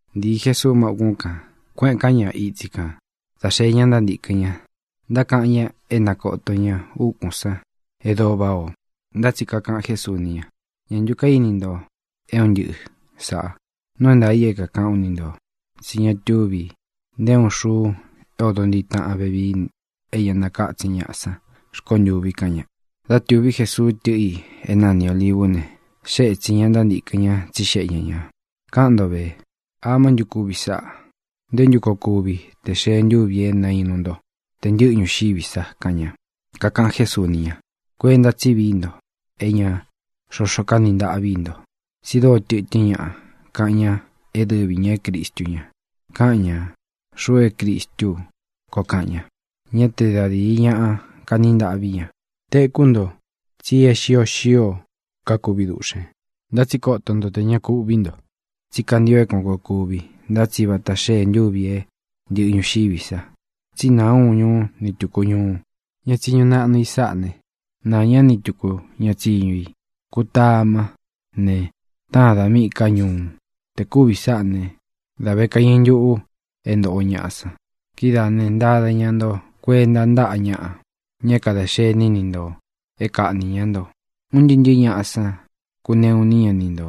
Ntīi Jesuu má ūkún kān. Kuéꞌēn ká ña itsi kān dá xee ña ntántīkɨn ña, ntákaꞌan ñá e na kōto ña úkūn sán e dóo váꞌā o. Ntá tsi kakaꞌan Jésuu ni ña: —¿Ñā ntu kaíni nto é un ntɨꞌɨ sāꞌa? Nuu é ntaā i é kākaꞌán u ni ntō, tsí ña tuvi nté uun xuu é ōdo ntiꞌi taꞌan vevii é ña nakátsin ñaꞌa san rkontûvi —kaꞌan ña. Dá tūví Jesuu tɨ́ꞌɨ i é nani Ōlivú ne, xée ētsin ña ntántīkɨn ña, tsíxeꞌe ña ñā: —Káꞌan nto vē: ¿Amá ntu kuvi sáꞌā? ¿Nté ntu koo kuvi te xee ntúvi e nainu nto, te ntɨꞌɨ ñuxiví sa? —kaꞌan ña. Kakaꞌan Jésuu ni ña: —Kuenta tsí vií nto e ña xoxo kaní ntaꞌví i nto. Tsi dóo tɨtɨ́n ñaꞌa kaꞌan ña é dɨvi ñā é Cristu ña. Kaꞌan ña: “Xuꞌu é Cristú u”, koo kaꞌan ña. Ñá te da dīi ñaꞌa kaní ntaꞌví ña. Tekú nto tsi é xio xío kakuvi duꞌxēn. Ntá tsi koto nto tē ña kuꞌví nto. Tsí kantio é kuān koo kuvi. Ntá tsi vata xée ntuvi e ntɨ́ꞌɨ ñuxiví sa. Tsí nāa uun ñuú ni tūku ñuu. Ña tsiñu naꞌnu i sáꞌā ne, naa ñá ni tūku ña tsiñu i. Kutamá ne, táan dā míꞌī ká ñuu. Te kūvi sáꞌā né, dā ve kaiñɨ ntuꞌu é ntōꞌo ñaꞌa san. ʼKidáā ne, ntada ñá nto kuenta ntáꞌa ñaꞌa, ña é kadā xení ni ntō, é kaꞌnī ñá nto. Un ntɨɨ́ ntɨ̄ɨ́ ñaꞌa san kuneꞌu iní ña ni nto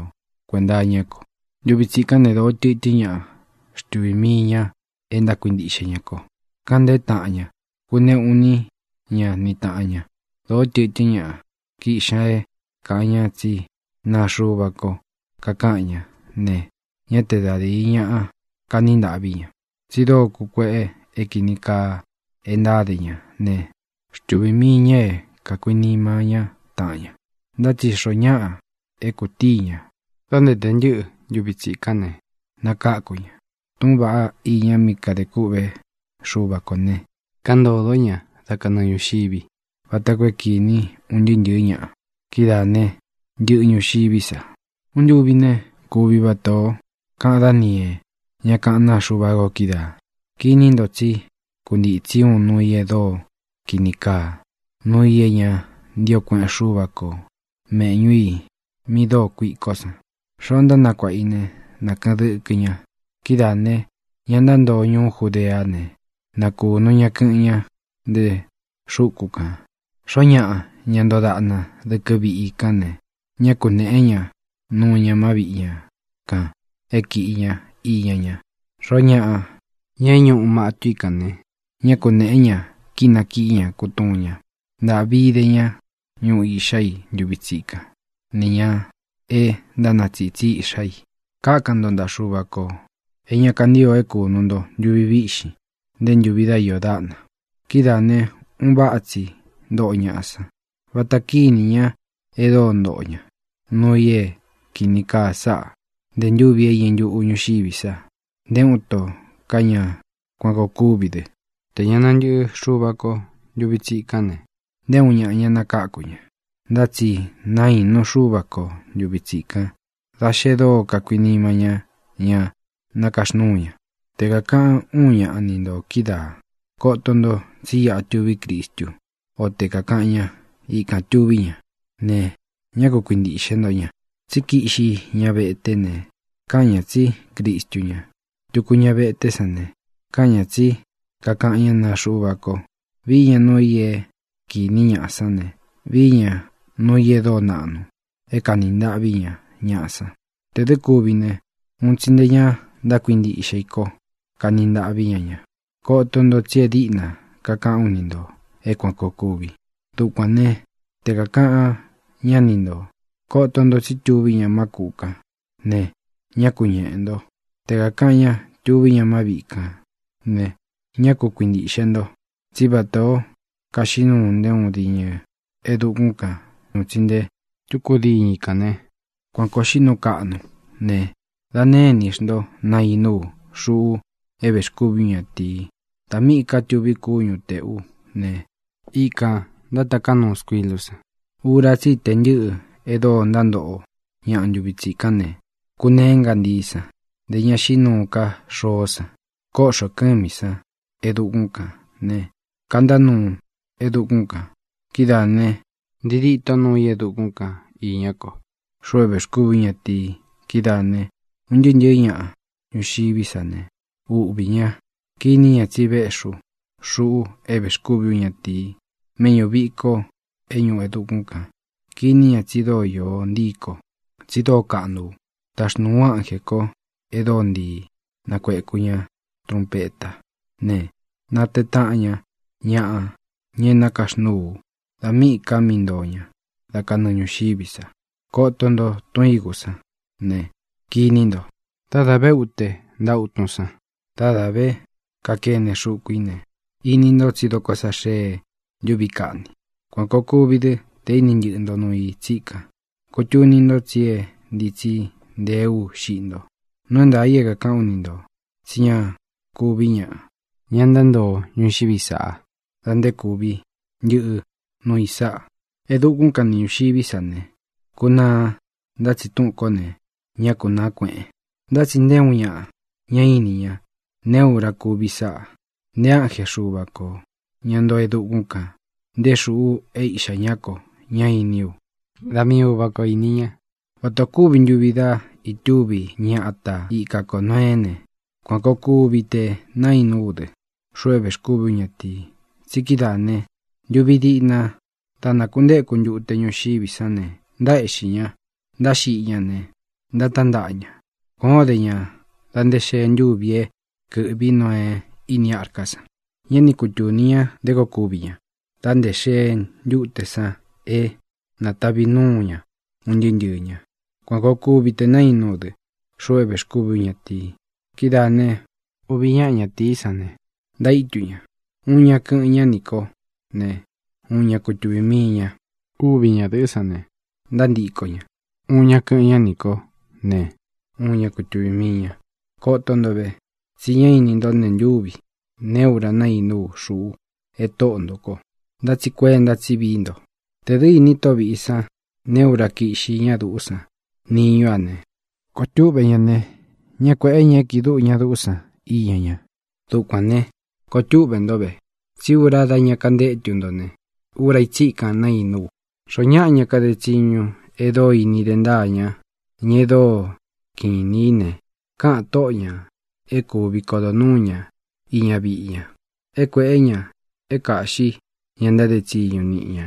kuēnta iñá ko. Ntuvi tsikán ne, dōó tɨtɨ́n ñaꞌa xtuvī mii ña e ntákuintiꞌxe ña ko. Káꞌan ntēé taꞌan ña. Kuneꞌu iní ña ni tāꞌan ña. Dōó tɨtɨ́n ñaꞌa kiꞌxi ña é kāꞌan ñá tsi naa Xuva ko kakaꞌan ñá ne, ñá te da dīi ñaꞌa kaní ntaꞌví ña. Tsi dóo kukueꞌe é kīni kaa e ntáde ña ne, xtuvī mii ña é kākuinima ñá taꞌan ña. Ntá tsi xoó ñaꞌa é kūtíi ñā da nté tē ntɨ́ꞌɨ ntuvi tsikán ne, nakáku ña. Túꞌūn vaꞌá iña mí kadē kûꞌvé Xuva kō ne, káꞌān ntodó ñaꞌa dá kanɨɨ ñūxiví, vata koo é kīni un ntɨɨ́ ntɨ̄ɨ́ ñaꞌa. Kidáā ne, ntɨꞌɨ ñuxiví sa. ʼUun ntuvi ne, kūví vata ō kaꞌan Dániee, ñá kaꞌán naa Xuva ko kídaā. Kiní nto tsí kuntitsi uun nuu i e dóo kīni kaa, nuu i é ña ntío kueꞌen Xúva ko, mēꞌñú i mí dóo kuikó san. (Xoó ntánakuāꞌa i né, na kɨ̄ꞌɨn dɨkɨ ña.) Kidáā ne, ña ntántoo ñuú Judeá ne, na kūnu ña kɨꞌɨn ñá nte xúku kān. Xoó ñaꞌa, ña ntoo daꞌna dɨkɨ viꞌi i kán ne, ñá kunēꞌé ña nuu ña má viꞌi ña kān é kīꞌi ña iña ña. Xoó ñaꞌa, ña é ñuꞌu mâtú i kān ne, ñá kunēꞌé ña kínakiꞌí ña kutuun ña. ¡Ntāꞌvi ide ñá ñuꞌu iꞌxá i ntuvi tsikán, nī ñá e ntánatsitsi iꞌxá i! Kákan nto ntaꞌa Xuva kō e ña kantío é kūnu nto ntuvi víꞌxin, nté ntūvi dá iō dáꞌna. Kidáā ne, un váꞌa tsi ntoꞌo ñaꞌa san. Váta kīní ñaꞌa e dóo ntoꞌo ña nuu i é kīni kaa sáꞌa nte ntúvi é iñɨ ntuꞌu ñūxiví sa. Nté uun ito ka ñá kuan kōo kuvi dɨ. Tē ña nantɨꞌɨ Xuva ko ntuvi tsíkán ne, nté uun ñaꞌa ña nakáku ña. Ntá tsi nainu Xúva ko ntūvi tsikan da xe dóo kakuinima ñá ña nákaxnúu ña. ʼTe kākaꞌán uun ñaꞌa ni ntō kídaā: “Koto nto, tsí iꞌa tuví Cristu”, o te kākaꞌan ña: “Ikān tuví ña”, ne, ñá ku kuintīꞌxe nto ña. Tsí kiꞌxi ña veté ne, kaꞌan ña tsí Cristu ña. Tuku ña veté san ne, kaꞌan ña tsí kakaꞌan ñá naa Xuva ko. Vií ña nuu i é kīní ñaꞌa san ne, vií ña nuu i e dóo naꞌnu é kāni ntaꞌví ña ñaꞌa san. Tē dɨ́ kuvi ne, un tsi nte ñá ntákuintiꞌxe i ko kaní ntaꞌví ña ña. Koto nto, tsi é diꞌna kakaꞌán u ni ntō é kuān koo kuvi. Dukuān né, te kākaꞌan ñá ni ntō: “Koto nto tsí tuví ña má kūꞌu kan”, ne, ñá ku ñeꞌē nto. Te kākaꞌan ña: “Tuví ña má viꞌi kān”, ne, ñá ku kuintīꞌxe nto. Tsí vatā ó kaxiꞌí nuu nté uun diñɨ i e dukún kān un tsi nté tuku diñɨ i kān né, kuan kōo xiꞌí nuu kaꞌnu ú ne, da née inī xnto nainu ú, xuꞌu é vēxkúvī ú ñatīi. Dā míꞌī ká tuví kúñu tēꞌú ne, ikān ntátaká nuu skuilú san. ʼUra tsí i tē ntɨ́ꞌɨ e dóo ntántoꞌo ñaꞌa ntuvi tsikán ne, kuneé ngantií san; ntē ña xiꞌí nuu ká xoó san. Kóꞌxō kɨ́mī san e dukún kān ne, kantá nuu e dukún kān. Kidáā ne, ntii díto nuu i e dukún kan īña kó, xuꞌu é vēxkúvī ú ñatīi. Kidáā ne, un ntɨɨ́ ntɨ̄ɨ́ ñaꞌa ñuxiví sa ne, uꞌvī ña. Kiní ña tsi véꞌxī ú, xuꞌu é vēxkúvī ú ñatīi, méꞌñū viko é ñuꞌu e dukún kān. Kiní ña tsi dóo iō ntii kó, tsi dóo kaꞌnu u. Taxnūu ú ánjē kó e dóo ntii nakuēku ña trunpetá ne, natee taꞌan ña ñaꞌa, ña é nakaxnúu ú, dā míꞌī ka mí ntoo ña da kanɨɨ ñūxiví sa. ʼKoto nto tun ígū sán ne, kiní nto: Dá dā vé ute ntaꞌa utun san, dá dā vé kakene xuku í ne, ini nto tsí dokó sa xee ntúvi kaꞌni. Kuan kōo kuvi dɨ́ te inī ntɨꞌɨ ntó nuu i tsíkan. Kutunī nto tsí é ntītsí nteé u xiꞌi nto. Nuu é ntaā i é kākaꞌán u ni ntō tsí ña kuví ñaꞌa, ña ntántoo ntuvi sáꞌa, dā nté kuvi ntɨꞌɨ nuu i sáꞌa. E dukún kan ni ñūxiví sa ne, kunaa, ntá tsi túꞌūn kó ne, ñá kunāa kueꞌen. ʼNtá tsi nté uun ñaꞌa ñá ini ña neé ura kuvi sáꞌā, nté ánje Xuva kō, ña ntoo e dukún kān, nté xuꞌu é Iꞌxā ñá ko ñá iní u. Da mii Uvā kó ini ña. ʼVata ō kúvi ntuvi dá ītúvi ña ata ika ko Nōeé ne, kuan kōo kuvi te nainú u dɨ, xuꞌu é vēxkúvī ú ñatīi. Tsi kidáā ne, ntuvi diꞌna dá nakuntéku ntute ñuxiví san ne, ntaéꞌxī ña ntáxiꞌi ña ne, ntatántaꞌa ña. Kuan ō dé ña da nté xee ntúvi é kɨ̄ꞌví Noee íni arká san. Ñá ni kutūni ña nté koo kuvi ña dā nté xee ntúte san é natavi núu ña un ntɨɨ́ ntɨɨ̄ ña. Kuan kōo kuvi te nainú u dɨ, xuꞌu é vēxkúvī ú ñatīi. Kidáā ne, uvi ñáꞌa ñatīí san ne, ntaítu ña. Uun ña kɨ́ꞌɨn ña nī kó ne, uun ña kutuvī mii ña. Úvi ñadɨ̄ꞌɨ́ san ne, ntántiko ña. Uun ña kɨꞌɨn ñá nī kó ne, uun ña kutuvī mii ña. ʼKoto nto ve, tsi ñá ini ntó nee ntúvi, neé ura nainú u, xuꞌu é Tóꞌo ntō ko. Ntá tsi kuenta tsí vií nto. Tē dɨ́ īni tóꞌo vīꞌi san neé ura kíꞌxi ña duꞌú san niñú a ne, koo túꞌvē ñá ne, ñá kuēꞌé ña é kiꞌi dúꞌu ña duꞌú san iña ña. Dukuān ne, koo túꞌvē nto ve. Tsí ura dá ña kantétu nto ne, ura í tsikan naínú u. ʼXoó ñaꞌa, ña kade tsiñu e dóo ini de ntáa ña, ña e dóo kiꞌin inī í ne, kaꞌan tóꞌo ñā é kuvi kodo nuū ñá iña viꞌi ña, é kuēꞌé ña é kāꞌxí ña ntáde tsiñu niꞌi ña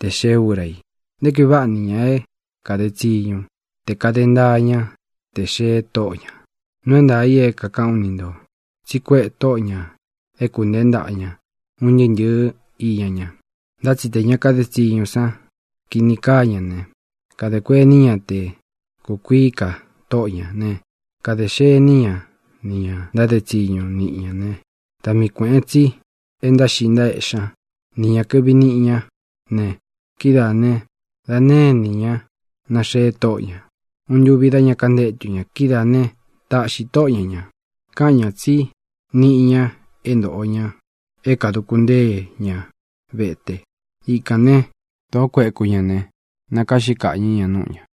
te xee úra i. ¡Nté kuī váꞌa nī ña é kade tsiñu te kāde ntaa ñá tē xee tóꞌo ñā! Nuu é ntaā i é kākaꞌán u ni ntō tsi kuéꞌe tóꞌo ñā é kūnteé ntaꞌa ña un ntɨɨ́ ntɨ̄ɨ́ iña ña. Ntá tsi te ña kade tsiñu san kini kaa ña ne, kadē kuení ña te kukuií ka tóꞌo ñā ne, kade xení ña nī ña ntáde tsiñu niꞌi ñā né, da mii kuēꞌen tsi e ntáxiꞌi ntaéꞌxi ña nī ña kɨꞌvi niꞌi ñá ne, kidáā ne, da née inī ñá naxee tóꞌo ña ūun ntuvi dá ña kantétu ña. Kidáā ne, taꞌxi tóꞌo ña ñā. Káꞌan ñā tsí niꞌi ña é ntōꞌo ña é kāduku ntée ña vete. Ikān né, dōó kueku ña ne, nakaꞌxí kaꞌñɨ̄ ña núꞌu ñā.